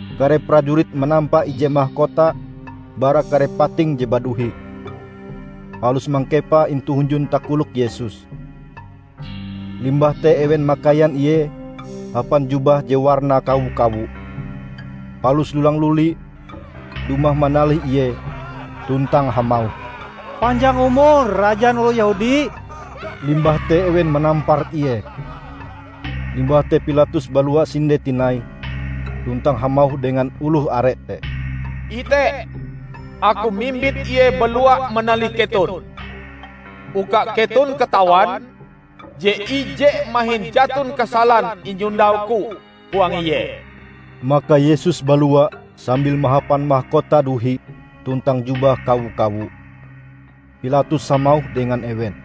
Kare prajurit manampa ije makota bara kare pating je baduhi, palus mangkepae intu hunjun takolok Yesus. Limbah te ewen makaian Ie hapan jubah je warnae kawo-kawo, palus lulang luli dumah manalih Ie tuntang hamauh, "Panjang umur rajan oloh Yehudi!" Limbah te ewen manampar Ie. Limbah te Pilatus balua sinde tinai tuntang hamauh dengan oloh are te, "Ite! Aku mimbit Ie balua manalih keton, uka keton katawan je ije mahin jaton kasalan inyondau-Ku huang Ie." Maka Yesus balua sambil mahapan makota duhi tuntang jubah kawo-kawo. Pilatus hamauh dengan ewen,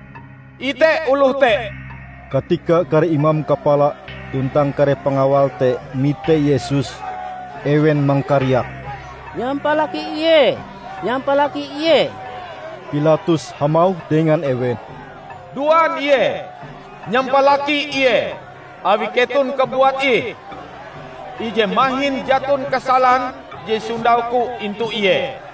"Ite oloh te." Katika kare imam kapala tuntang kare pangawal te mite Yesus, ewen mangkariak, "Nyampalaki Ie! Nyampalaki Ie!" Pilatus hamauh dengan ewen, "Duan Ie, nyampalaki Ie awi keton kabuat ih, ije mahin jaton kasalan je sondau-Ku intu Ie."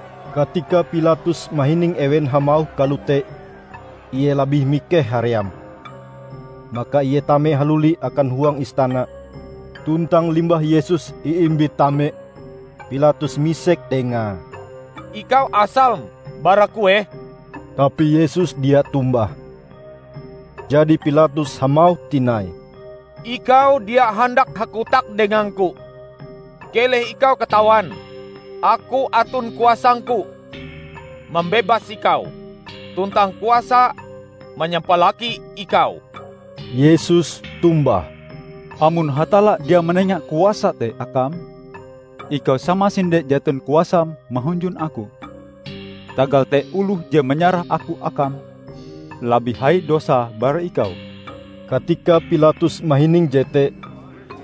Katika Pilatus mahining ewen hamauh kalote, ie labih mikeh haream. Maka ie tame haluli akan huang istana tuntang limbah Yesus iimbit tame, Pilatus misek dengae, "Ikau asalm bara kueh?" Tapi Yesus dia tombah. Jadi Pilatus hamauh tinai, "Ikau dia handak hakotak dengang-Ku. Keleh ikau katawan, aku aton kuasangku mambebas ikau, tuntang kuasa manyampalaki ikau!" Yesus tombah, "Amon Hatalla dia manenga kuasa te akam, ikau samasinde jaton kuasam mahunjun Aku. Tagal te oloh je manyarah Aku akam, labih hai dosae bara ikau." Katika Pilatus mahining jete,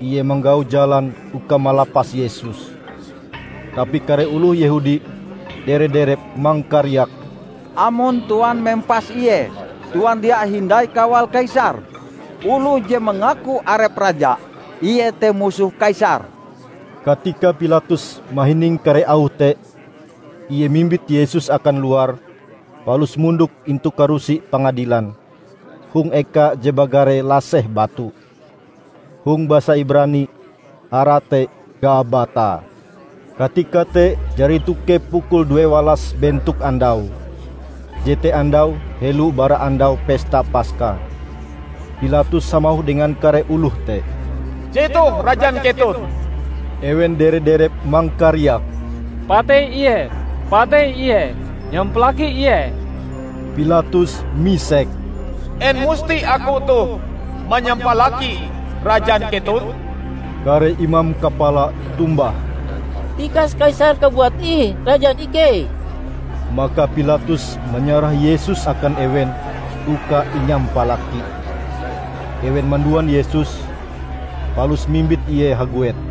ie manggau jalan uka malapas Yesus. Tapi kare oloh Yehudi dere-derep mangkariak, "Amon tuan mempas ie, tuan dia hindai kawal Kaisar! Oloh je mangaku arepe raja, Ie te musoh Kaisar!" Katika Pilatus mahining kare auh te, ie mimbit Yesus akan luar palus mondok intu karusi pangadilan hong eka je bagare Laseh Batu. (Hong basa Ibrani arae te Gabata.) Katika te jari tokep pukul duewalas bentok andau, jete andau helo bara Andau Pesta Paska. Pilatus hamauh dengan kare oloh te, "Jetoh rajan keton!" Ewen dere-derep mangkariak, "Patei Ie! Patei Ie! Nyampalaki Ie!" Pilatus misek, "En musti aku toh manyampalaki rajan keton?" Kare imam kapala tombah, "Tikas Kaisar kabuat ih rajan ikei!" Maka Pilatus manyarah Yesus akan ewen uka inyampalaki. Ewen manduan Yesus, palus mimbit Ie haguet.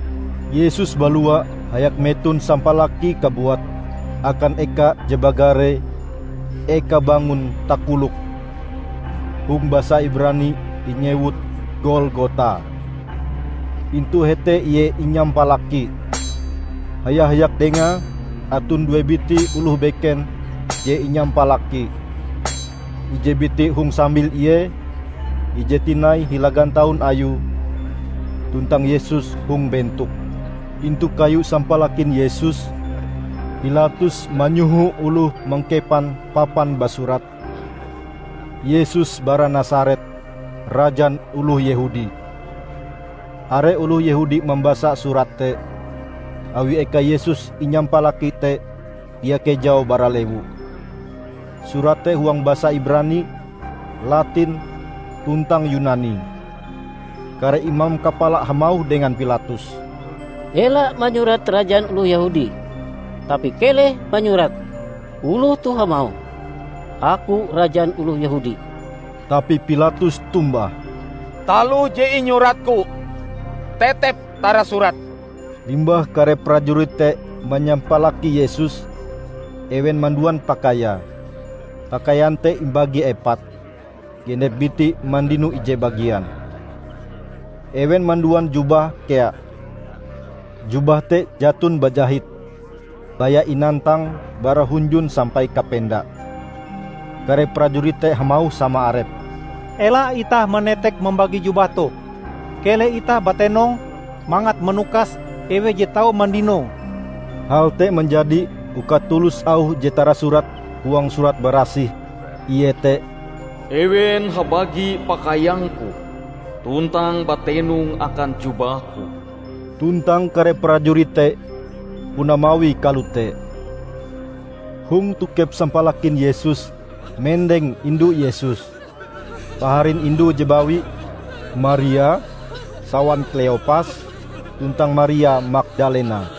Yesus balua hayak meton sampalakie kabuat akan eka je bagare "Eka Bangon Takolok". (Hong basa Ibrani inyewut Golgota). Intu hete Ie inyampalaki. Haya-hayak Dengae aton due biti oloh beken je inyampalaki: ije biti hong sambil Ie, ije tinai hila gantaun Ayue tuntang Yesus hong bentok. Intu kayu sampalakin Yesus, Pilatus manyoho oloh mangkepan papan basurat: "Yesus bara Nasaret, Rajan oloh Yehudi". Are oloh Yehudi mambasa surat te, awi eka Yesus inyampalaki te dia kejau bara lewu. Surat te huang basa Ibrani, Latin, tuntang Yunani. Kare imam kapala hamauh dengan Pilatus, "Ela manyurat 'Rajan oloh Yehudi', tapi keleh manyurat 'Oloh toh hamauh, Aku Rajan oloh Yehudi.' " Tapi Pilatus tombah, "Taloh je inyuratku, tetep tarasurat." Limbah kare prajurit te manyampalaki Yesus, ewen manduan pakaiae. Pakaian te imbagi epat: genep biti mandino ije bagian. Ewen manduan jubahe kea. Jubah te jaton bajahit -- baya inantang bara hunjun sampai kapenda. Kare prajurit te hamauh sama arepe, "Ela itah manetek mambagi jubah toh. Keleh itah batenong mangat manukas eweh je tau mandinoe." Hal te manjadi uka tulus auh je tarasurat huang Surat Barasih, iete: "Ewen habagi pakaiang-Ku, tuntang batenong akan jubah-Ku." Tuntang kare prajurit te puna mawie kalote. Hong tokep sampalakin Yesus mendeng indu Yesus, paharin indue je bawi, Maria sawan Kleopas, tuntang Maria Magdalena.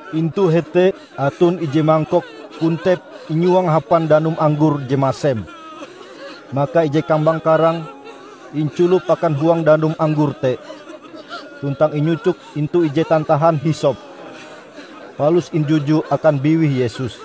Intu hete aton ije mangkok kontep inyuang hapan danum anggor je masem. Maka ije kambang karang inculop akan huang danum anggor te, tuntang inyucok intu ije tantahan hisop, palus injuju akan biwih Yesus.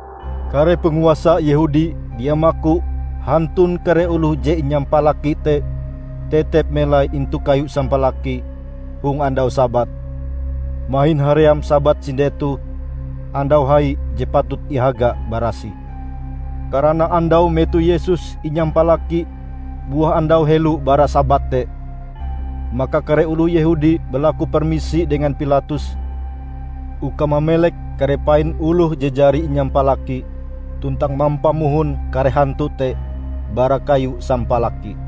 Kare panguasa Yehudi dia maku hantun kare oloh je inyampalaki te tetep melai intu kayu sampalaki hong andau Sabat, mahin haream Sabat sinde toh Andau Hai je patut ihaga barasih. Karana andau metoh Yesus inyampalaki buah andau helo bara Sabat te, maka kare oloh Yehudi balaku permisi dengan Pilatus uka mamelek kare pain oloh je jari inyampalaki tuntang mampamohon kare hantu te bara kayu sampalaki.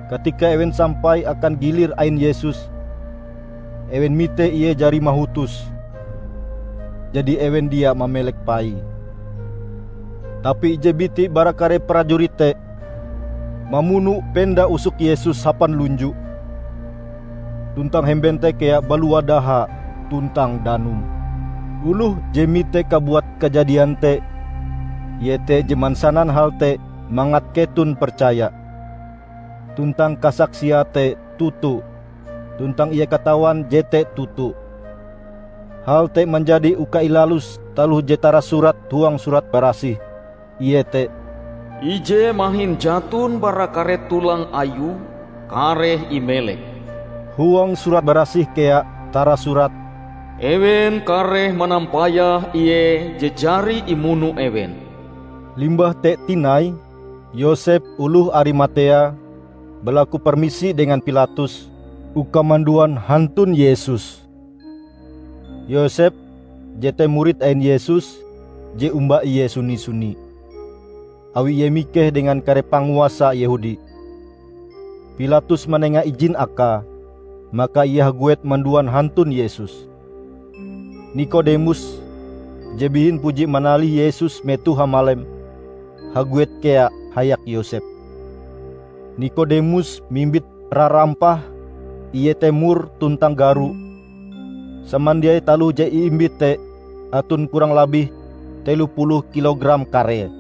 Katika ewen sampai akan gilir ain Yesus, ewen mite Ie jari mahutos. Jadi ewen dia mamelek paie. Tapi ije biti bara kare prajurit te mamuno penda usok Yesus hapan lunju; tuntang hemben te kea balua daha tuntang danum. Oloh je mite kabuat kajadian te, ie te je mansanan hal te mangat keton percaya. Tuntang kasaksiae te toto, tuntang ie katawan jete toto. Hal te manjadi uka ilalus taloh je tarasurat huang Surat Barasih, iete, "Ije mahin jaton bara kare tolang Ayue kareh imelek." Huang Surat Barasih kea tarasurat, "Ewen kareh manampayah Ie je jari imuno ewen". Limbah te tinai Yosep oloh Arimatea balaku permisi dengan Pilatus uka manduan hantun Yesus. (Yosep jete murid ain Yesus je omba Ie suni-suni, awi ie mikeh dengan kare panguasa Yehudi.) Pilatus manenga ijin akae, maka ie haguet manduan hantun Yesus. Nikodemus je bihin puji manalih Yesus metoh hamalem, haguet kea hayak Yosep. Nikodemus mimbit rarampah iete mur tuntang garo -- samandiai taloh je iimbite te aton kurang labih telo puluh kilogram karee.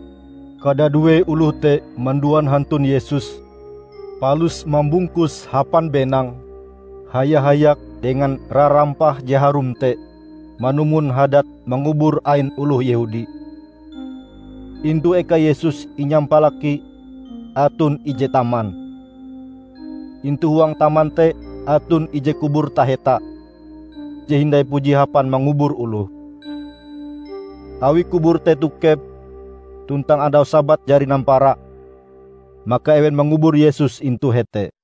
Kadadue oloh te manduan hantun Yesus palus mambungkuse hapan benang haya-hayak dengan rarampah je harum te manumon hadat mangubur ain oloh Yehudi. Intu eka Yesus inyampalaki aton ije taman. Intu huang taman te aton ije kubur taheta, je hindai puji hapan mangubur oloh. Awi kubur te tokep, tuntang andau Sabat jari nampara, maka ewen mangubur Yesus intu hete.